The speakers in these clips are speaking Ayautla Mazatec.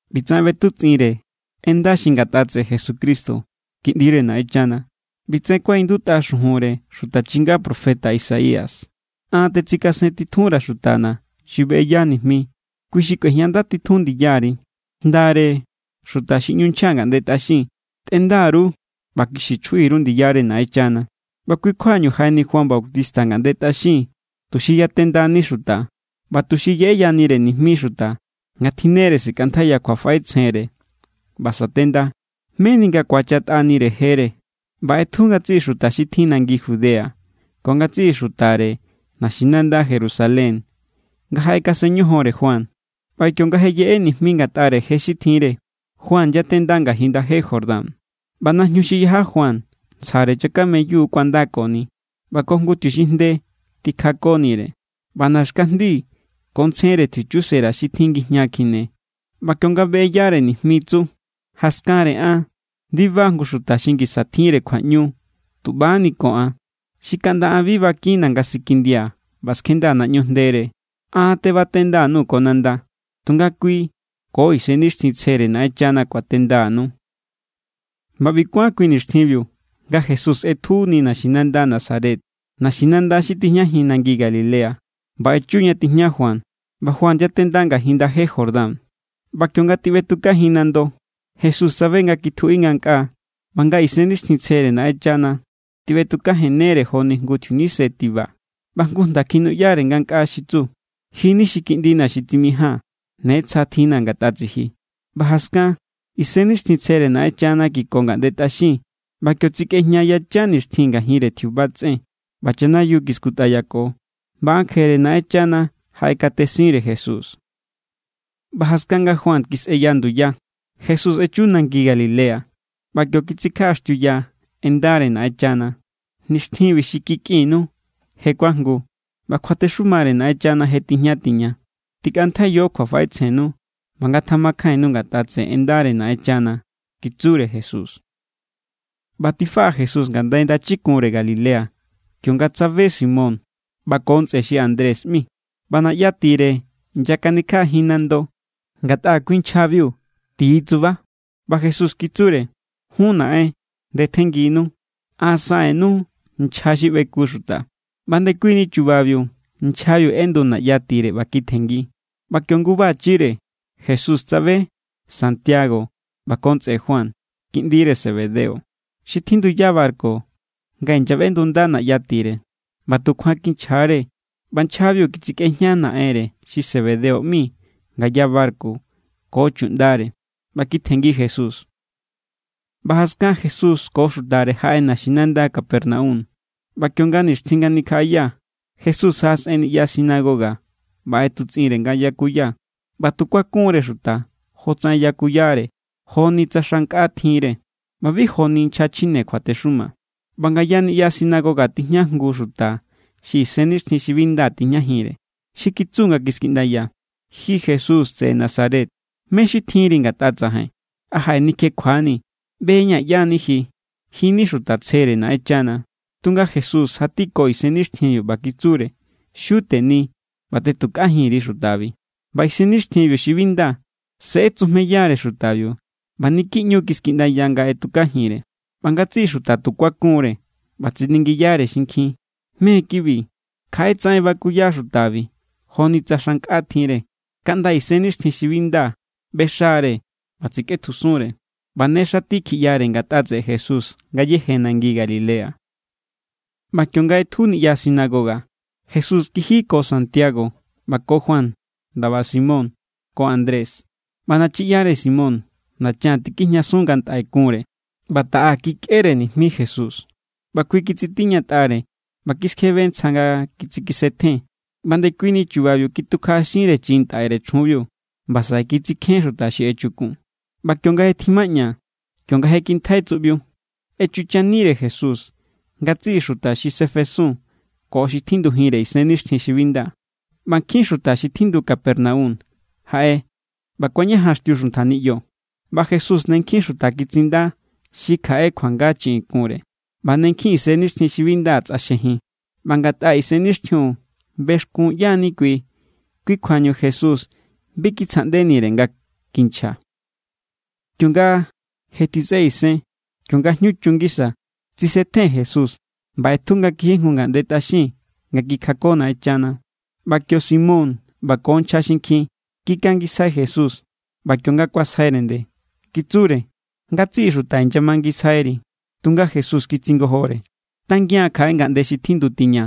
ꞌBitsaꞌen ꞌbetutsꞌinre en nda xi ngatꞌa tseꞌe Jesucristo, Kiꞌndire Naꞌenchana. ꞌBitsaꞌen kuaꞌindutꞌa xujunre xuta chinga profeta Isaías: An tetsikasentitjunra̱ xutana̱ xi beꞌeya nijmi. Kui xi kꞌuejñandatitjun ndiyari. Jndare xuta xi ꞌñu nchja ngaꞌnde tꞌaxin: “Tꞌenda_ru ꞌba kixi chjuꞌi_ru ndiyare Naꞌenchana.” ꞌBa kui= kjuañu jaꞌeni Juan Bautista ngaꞌnde tꞌaxin tuxi yatendani xuta ꞌba tuxi yeꞌeyanire nijmi xuta nga tjinnere sikꞌantjaiya kjuafaꞌetsjenre ꞌba sa̱tenda, meni nga ku̱achatꞌanire jere. ꞌBa ꞌetju ngatsiꞌi xuta xi tjin nangi Judea ko ngatsiꞌi xutare naxinanda Jerusalén nga jaꞌekasen ñojonre Juan. ꞌBa kionga je yeꞌe nijmi ngatꞌare je xi tjinre, Juan yatenda ngajin ndaje Jordán. ꞌBa najñu xi yaja Juan ntsjare chakameyu kuandakoni, ꞌba ko jngu tjiuxinjnde tikjakonire. ꞌBa naxkajndi ko ntsjenre tjiuchusera xi tjin ngijña kjine. ꞌBa kionga beꞌeyare nijmi, tsu: —Jaskanre an ndiba jngu xuta xi ngisa tjinre kjuaꞌñu tuꞌbani ko an xi kaꞌnda an bi bakinna̱ nga sikindia̱ ꞌba skjendaa̱ naꞌñu jndere. An tebatenda_nuu̱ ko nanda; tunga kui ko Isennixtjintsjere Naꞌenchana kuatendanu. ꞌBa ꞌbi kuán kui nixtjinbiu nga Jesús ꞌetjuni naxinanda Nazaret, naxinanda xi tijñajin nangi Galilea, ꞌba echu ña tijña Juan. ꞌBa Juan yatenda ngajin ndaje Jordán. ꞌBa kionga tiꞌbetukajin nando, Jesús tsabe nga kitjuꞌi ngankꞌaa, ꞌba nga Isennixtjintsjere Naꞌenchana tiꞌbetukajennere joni jngu tjiunise tiba. ꞌBa jngu jnda kjinuꞌyanire ngankꞌaa xi tsu: —Ji= ni xi kiꞌndina̱ xi tsimijaa̱n. Ne tsja tjinna̱ ngatꞌa tsiji. ꞌBa jaskan, Isennixtjintsjere Naꞌenchana kiko ngaꞌnde tꞌaxin. ꞌBa kio tsikꞌejña yachan nixtjin ngajinre tjiuba tsꞌen, ꞌba chanayiu kiskutꞌayako. ꞌBa ankjere Naꞌenchana jaꞌekatesinre Jesús. ꞌBa jaskan nga Juan kisꞌeya nduya, Jesús echu nangi Galilea, ꞌba kio kitsikjaꞌaxtiuya en ndare Naꞌenchana. —Nixtjinbi xi kikꞌinnu je kuajngu ꞌba kjuatexumare Naꞌenchana je tijña tiña. Tikꞌantjaiyo kjuafaꞌetsjennu, ꞌba ngatamakjainnu ngatꞌa tseꞌe en ndare Naꞌenchana —kitsure Jesús. ꞌBa tifaꞌa Jesús ngandai ndachikunre Galilea, kionga tsabe Simón ꞌba ko ntsꞌe xi Andrés ꞌmi. ꞌBa naꞌya tire inyakanikjaꞌajin nando, ngatꞌa kui nchjabiu xi ti= tsuba. ꞌBa Jesús kitsure: —Jun naꞌen, ndetjennginu. An saꞌen_nuu̱ nchja xi ꞌbeku xuta. ꞌBa ndekuini chubabiu nchjabiu ꞌendu naꞌya tire ꞌba kitjenngi. ꞌBa kio nguba chire Jesús tsabe Santiago ꞌba ko ntsꞌe Juan, kiꞌndire Zebedeo, xi tjinduya barku nga inyaꞌbendunda naꞌya tire. ꞌBa tukjuan kinchja=re, ꞌba nchjabiu kitsikꞌejña naꞌenre xi Zebedeo ꞌmi ngaya barku ko chuꞌndare ꞌba kitjenngi Jesús. ꞌBa jaskan Jesús ko xutare jaꞌe naxinanda Capernaum. ꞌBa kionga nixtjin nga nikjaꞌaya, Jesús jaꞌasꞌen niꞌya sinagoga ꞌba ꞌetutsꞌinre nga yakuya. ꞌBa tu kuakun=re xuta jotsaꞌen yakuyare joni tsa xa nkꞌa tjinre, ꞌba bi joni nchja chjine kjuatexuma. ꞌBa ngaya niꞌya sinagoga tijña jngu xuta xi isennixtjin xi bi nda tijñajinre, xi kitsu nga kiskiꞌndaya: —Ji Jesús tseꞌe Nazaret, ¿mé= xi tjinri ngatꞌa tsajain? ¿A jaꞌenikjekjuanii̱? ꞌBe=ña̱ ꞌyá= ni ji. Ji= ni xuta tsjere Naꞌenchana. Tunga Jesús jatiko isennixtjinbiu ꞌba kitsure: —¡Xiu teni ꞌba tꞌetukajin_ri xutabi! ꞌBa isennixtjinbiu xi bi nda se ꞌetsujmeyare xutabiu, ꞌba niki ꞌñu= kiskiꞌndaya nga ꞌetukajinre. ꞌBa ngatsiꞌi xuta tu kuakun=re, ꞌba tsiningiyare xinkjin: —¿Mé= kibi? Kjaꞌe tsaꞌen bakuya xutabi, joni tsa xa nkꞌa tjinre. ¡Kaꞌnda isennixtjin xi bi nda ꞌbexa=re ꞌba tsikꞌetjusunre! ꞌBa ne xati kjiꞌyare ngatꞌa tseꞌe Jesús ngayéje nangi Galilea. ꞌBa kionga ꞌetju niꞌya sinagoga, Jesús kiji ko Santiago ꞌba ko Juan ndaba Simón ko Andrés. ꞌBa nachiꞌyare Simón nachan tikijñasun nga ntꞌai kunre. ꞌBa taꞌa kikꞌere nijmi Jesús. ꞌBa kui kitsitiñatꞌare ꞌba kiskjebe ntsja nga kitsikisetjen. ꞌBa ndekuini chubabiu kitukjaꞌaxinre chiꞌin ntꞌaire chjunbiu. ꞌBa saꞌe kitsikjén xuta xi echukun. ꞌBa kionga je tjimaꞌña, kionga je kintjai tsuꞌbiu, echuchanire Jesús ngatsiꞌi xuta xi sefesun ko xi tjindujinre isennixtjin xi bi nda. ꞌBa nkjin xuta xi tjindu Capernaum jaꞌe ꞌba kuañajanxtiu xuntja niꞌyo. ꞌBa Jesús ne nkjin xuta kitsinda xi kjaꞌe kjuanga chiꞌin kunre, ꞌba ne nkjin isennixtjin xi bi nda tsꞌaxjejin. ꞌBa ngatꞌa isennixtjinbiu bexkun ꞌyá=ñu kui, kui= kjuañu Jesús bi kitsjaꞌndenire nga kinchja. Kionga je tjisꞌe isen, kionga jñu chun ngisa, tsisetjen Jesús ꞌba ꞌetju nga kiji jngu ngaꞌnde tꞌaxin nga kikjako Naꞌenchana. ꞌBa kio Simón ꞌba ko nchja xinkjin kikangisjai Jesús. ꞌBa kionga kuasjaire nde, kitsure: —Ngatsiꞌi xuta inyamangisjairi. Tunga Jesús kitsingojore: —Tangian kjaꞌe ngaꞌnde xi tjindu tiña,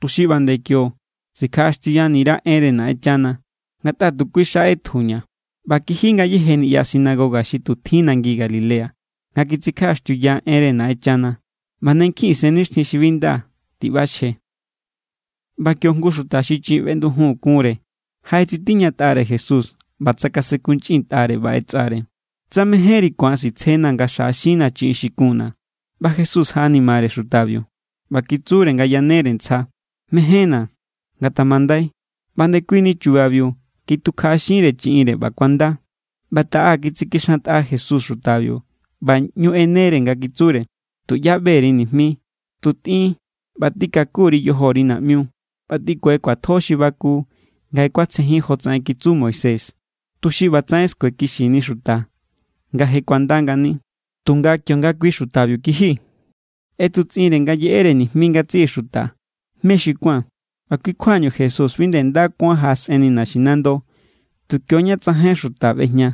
tuxi ꞌba nde kio sikjaꞌaxtiuyani_ra̱ enre Naꞌenchana; ngatꞌa tu kui xa ꞌetjuña̱. ꞌBa kiji ngayéje niꞌya sinagoga xi tu tjin nangi Galilea, nga titsikjaꞌaxtiuya enre Naꞌenchana, ꞌba ne nkjin isennixtjin xi bi nda tiꞌbaxje. ꞌBa kio jngu xuta xi chiꞌin feꞌndujun kunre jaꞌetsitiñatꞌare Jesús ꞌba tsakasenkunchꞌintꞌare ꞌba ꞌetsꞌare: —Tsa mejénri ku̱an sitsjenaa̱ nga xjaꞌaxinnaa̱ chiꞌin xi kunna̱. ꞌBa Jesús jaꞌanimare xutabiu, ꞌba kitsure nga yanere ntsja: —Mejénna̱. Ngatamandai. ꞌBa ndekuini chubabiu, kitukjaꞌaxinre chiꞌinre, ꞌba kuanda. ꞌBa taꞌa kitsikixantꞌa Jesús xutabiu, ꞌba ꞌñu ꞌenere nga kitsure: —Tuꞌyá ꞌbe_ri nijmi; tu tꞌin ꞌba tikaku_ri yojori naꞌmiu. ꞌBa tꞌikue kjuatjo xi baku nga je kuatsjejin jotsaꞌen kitsu Moisés, tuxi ꞌbatsaꞌen skuekixini xuta nga je kuanda ngani. Tunga kionga kui xutabiu kiji, ꞌetutsꞌinre nga yeꞌere nijmi ngatsiꞌi xuta mé xi tu kuán. ꞌBa kui= kjuañu Jesús bi nde nda kuán jaꞌasꞌenni naxinando, tu kioña tsajain xuta ꞌbejña.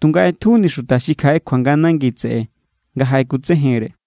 Tunga ꞌetjuni xuta xi kjaꞌe kjuanga nangi tseꞌe nga jaꞌekutsejenre.